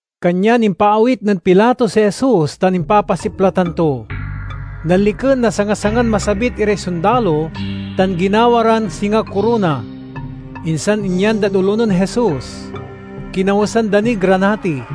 Kanyan impaawit nen Pilato si Jesus tan impapasiplatan to. Nanliken na sanga-sangan masabit iray sondalo tan ginawa ran singa korona, insan inyan dad olo nen Jesus. Kinawesan da niy granati.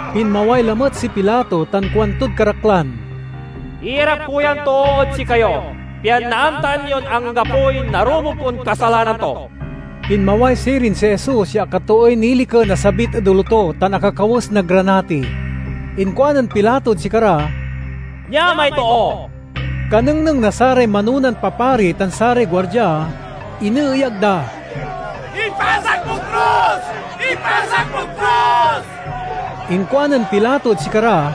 Pinmaway lamet si Pilato tan kuantod karaklan, "Iyarap ko yan too ed sikayo, pian naamtaan yon anggapoy narumog kon kasalanan to." Pinmaway sirin si Jesus ya akatooy niliken a sabit ed olo to tan akakawes na granati. Inkuanen Pilato ed sikara, "Nia may too!" Kanengneng na saray manonan papari tan saray guardia, ineeyag da, "Ipasak mod krus! Ipasak mod krus!" Inkuanen Pilato ed sikara,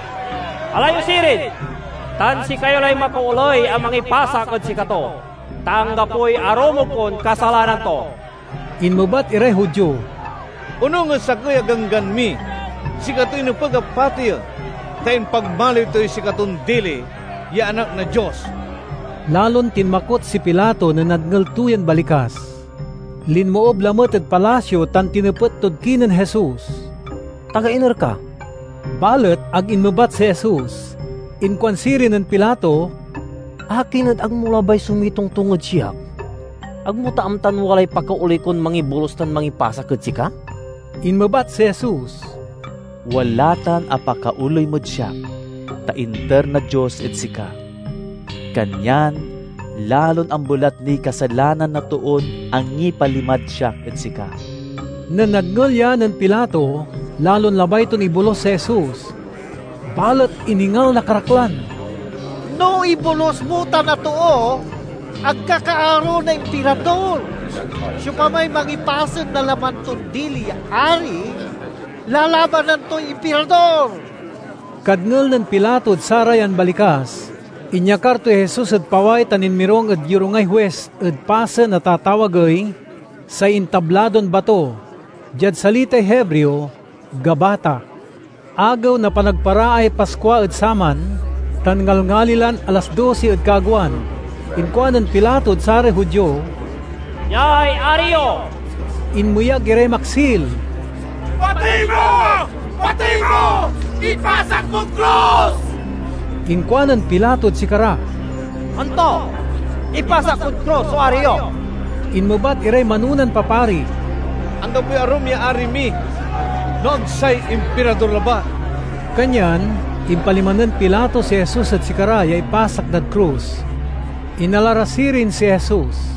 "Ala yo sirin tan sikayo lay makaoley a mangipasak ed sikato, ta anggapoy arumog kon kasalanan to." Inmebat iray Judio, "Onung ed sakey a ganggan mi, sikatoy nepeg a pateyen, ta impagmaliw toy sikaton dili ya Anak na Dios." Lalon tinmakot si Pilato nen nadngel to yan balikas. Linmoob lamet ed palasio tan tinepet tod kinen Jesus, "Taga iner ka?" Balet ag inmebat si Jesus. Inkuan sirin nen Pilato, "Akin et ag mo labay so mitongtong ed siak? Ag mo ta amtan walay pakaoley kon mangibolus tan mangipasak ed sika?" Inmebat si Jesus, "Wala tan a pakaoley mod siak, ta inter na Dios ed sika. Kanyan lalon ambelat niy kasalanan na toon angipalimad siak ed sika." Nen nadngel ya nen Pilato, lalon labay ton ibolus si Jesus. Balet iningal na karaklan, "No ibolus mo tan a too, ag ka kaaro na Impirador. Siopamay mangipasen na laman ton dili ya ari, lalabanan toy Impirador!" Kadngel nen Pilato ed sarayan balikas, inyakar toy Jesus ed paway tan inmirung ed yorungay huis ed pasen a tatawagey "Say Intabladon Bato" (diad salitay Hebreo, "Gabata"). Agew na Panagparaay Paskua ed saman, tan ngalngali lan alas dosi ed kaagewan. Inkuanen Pilato ed saray Judio, "Niay ari yo!" Inmeyag iray maksil, "Patey mo! Patey mo! Ipasak mod krus!" Inkuanen Pilato ed sikara, "Anto, ipasak kod krus so ari yo?" Inmebat iray manonan papari, "Anggapoy arum ya ari mi no ag say Impirador labat!" Kanyan impalima nen Pilato si Jesus ed sikara ya ipasak dad krus. Inala ra sirin si Jesus,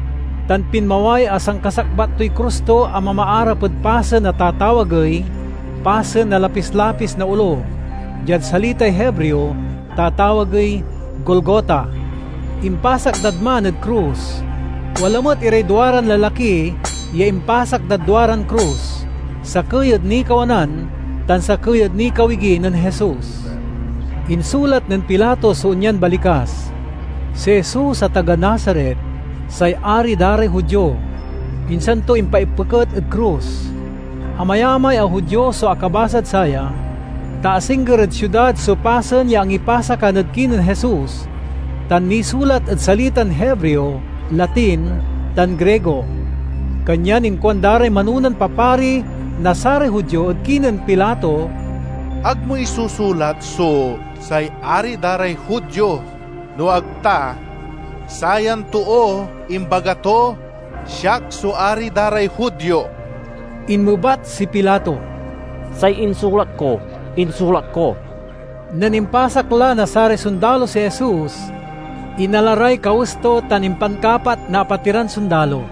tan pinmaway a sankasakbat toy krus to a mamaarap ed pasen a tatawagey "Pasen na Lapis-lapis na Olo." (Diad salitay Hebreo, tatawagey "Golgota.") Impasak dad man ed krus. Wala met iray duaran lalaki ya impasak dad duaran krus, sakey ed nikawanan tan sakey ed nikawigi nen Jesus. Insulat nen Pilato so onyan balikas: "Si Jesus a taga Nazaret, say Ari da ray Judio," insan to impaipeket ed krus. Amayamay a Judio so akabasad saya, ta asingger ed siudad so pasen ya angipasakan ed kinen Jesus, tan nisulat ed salitan Hebreo, Latin, tan Grigo. Kanyan inkuan da ray manonan papari na saray Judio ed kinen Pilato, "Ag mo isusulat so 'Say Ari da ray Judio,' no ag ta, 'Sayan too imbaga to, Siak so Ari da ray Judio.'" Inmebat si Pilato, "Say insulat ko, insulat ko." Nen impasak la na saray sondalo si Jesus, inala ray kawes to tan impankapat na apatiran sondalo.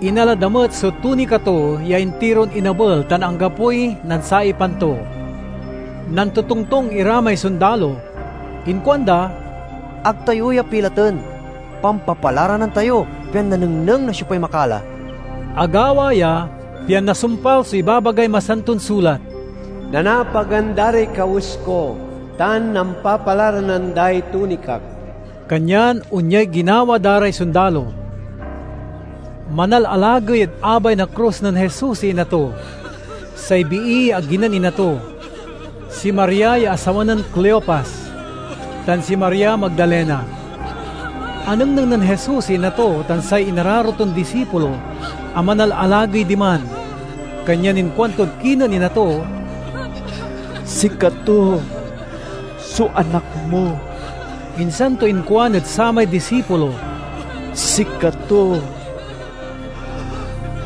Inala da met so tunika to ya intiron inabel tan anggapoy nansaipan to. Nantotongtong ira may sondalo. Inkuanda, "Ag tayo ya pilaten. Pampapalaranan tayo, pian nanengneng no siopay makala." Agawa ya pian nasumpal so ibabagay Masanton Sulat: "Nanaapagan da ray kawes ko, tan nampapalaranan day tunikak." Kanyan onyay ginawa da ray sondalo. Manalalagey ed abay na krus nen Jesus si ina to, say bii ya agi nen ina to, si Maria ya asawa nen Cleopas, tan si Maria Magdalena. Anengneng nen Jesus si ina to tan say inararo ton disipulo a manalalagey diman, kanyan inkuantod kinen ina to, "Sikato so anak mo." Insan to inkuan ed samay disipulo, "Sikato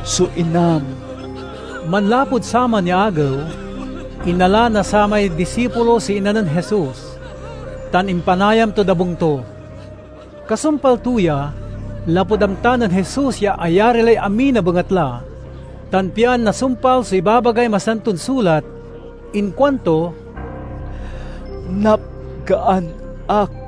so inam." Manlapud saman ya agew, inala na samay disipulo si ina nen Jesus, tan impanayam tod abung to. Kasumpal to ya, lapud amta nen Jesus ya ayari lay amin a bengatla, tan pian nasumpal so ibabagay Masanton Sulat, inkuanto, "Napgaan ak!"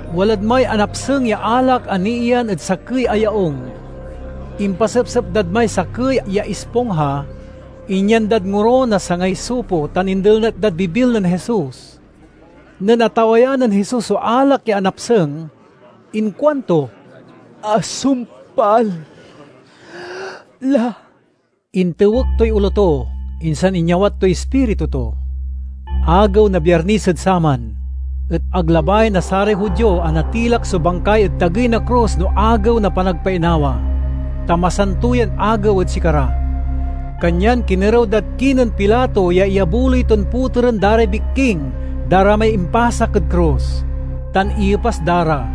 Walad may anapseng ya alak a niiyan ed sakey a yaung. Impasepsep dad may sakey ya ispongha, inyan dad ngoro na sangay isopo tan indelnet dad bibil nen Jesus. Nen atawayan nen Jesus so alak ya anapseng inkuanto, "Asumpal la!" Intuek toy olo to, insan inyawat toy ispiritu to. Agew na Biarnes ed saman, et ag labay na saray Judio a natilak so bangkay ed tagey na krus no Agew na Panagpainawa, ta masanto yan agew ed sikara. Kanyan kinerew dad kinen Pilato ya iyabuloy ton poteren da ray bikking da ra may impasak ed krus, tan iyepas da ra.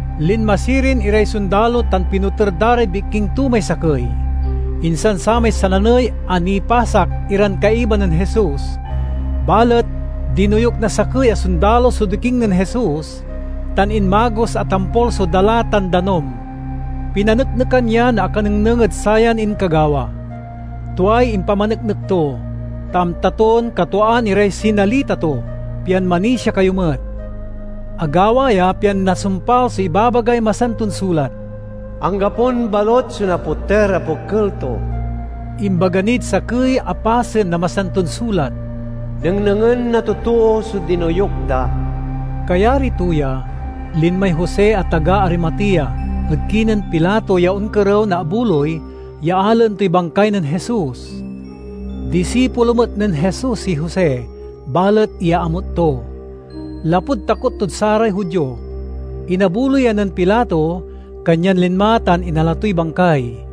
Linma sirin iray sondalo tan pinoter da ray bikking to may sakey, insan samay sananey a nipasak iran kaiba nen Jesus. Balet dinoyuk na sakey a sondalo so diking nen Jesus, tan inmagos a tampol so dala tan danum. Pinaneknekan ya na akanengneng ed sayan inkagawa. Tuay impamaneknek to, ta amta ton katwaan iray sinalita to pian manisia kayo met. Agawa ya pian nasumpal so ibabagay Masanton Sulat, "Anggapon balut so napoter a pokel to." Imbaga nid sakey a pasen na Masanton Sulat, "Nengnengen na totoo so dinoyuk da." Kayari to ya, linmay Jose a taga Arimatea ed kinen Pilato ya onkerew na abuloy ya alaen toy bangkay nen Jesus. (Disipulo met nen Jesus si Jose balet iyaamut to, lapud takot tod saray Judio.) Inabuloyan nen Pilato, kanyan linma tan inala toy bangkay.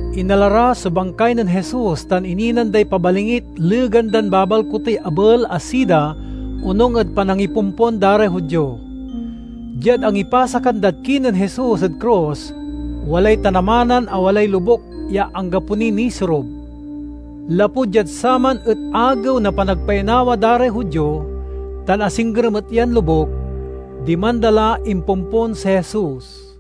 Inala ra so bangkay nen Jesus tan ininan day pabalingit legan dan babalkutey abel a sida onung ed panangipompon da ray Judio. Diad angipasakan dad kinen Jesus ed krus, walay tanamanan a walay lobuk ya anggapo niy nisorub. Lapud diad saman et Agew na Panagpainawa da ray Judio, tan asingger met yan lobuk, diman da la impompon si Jesus.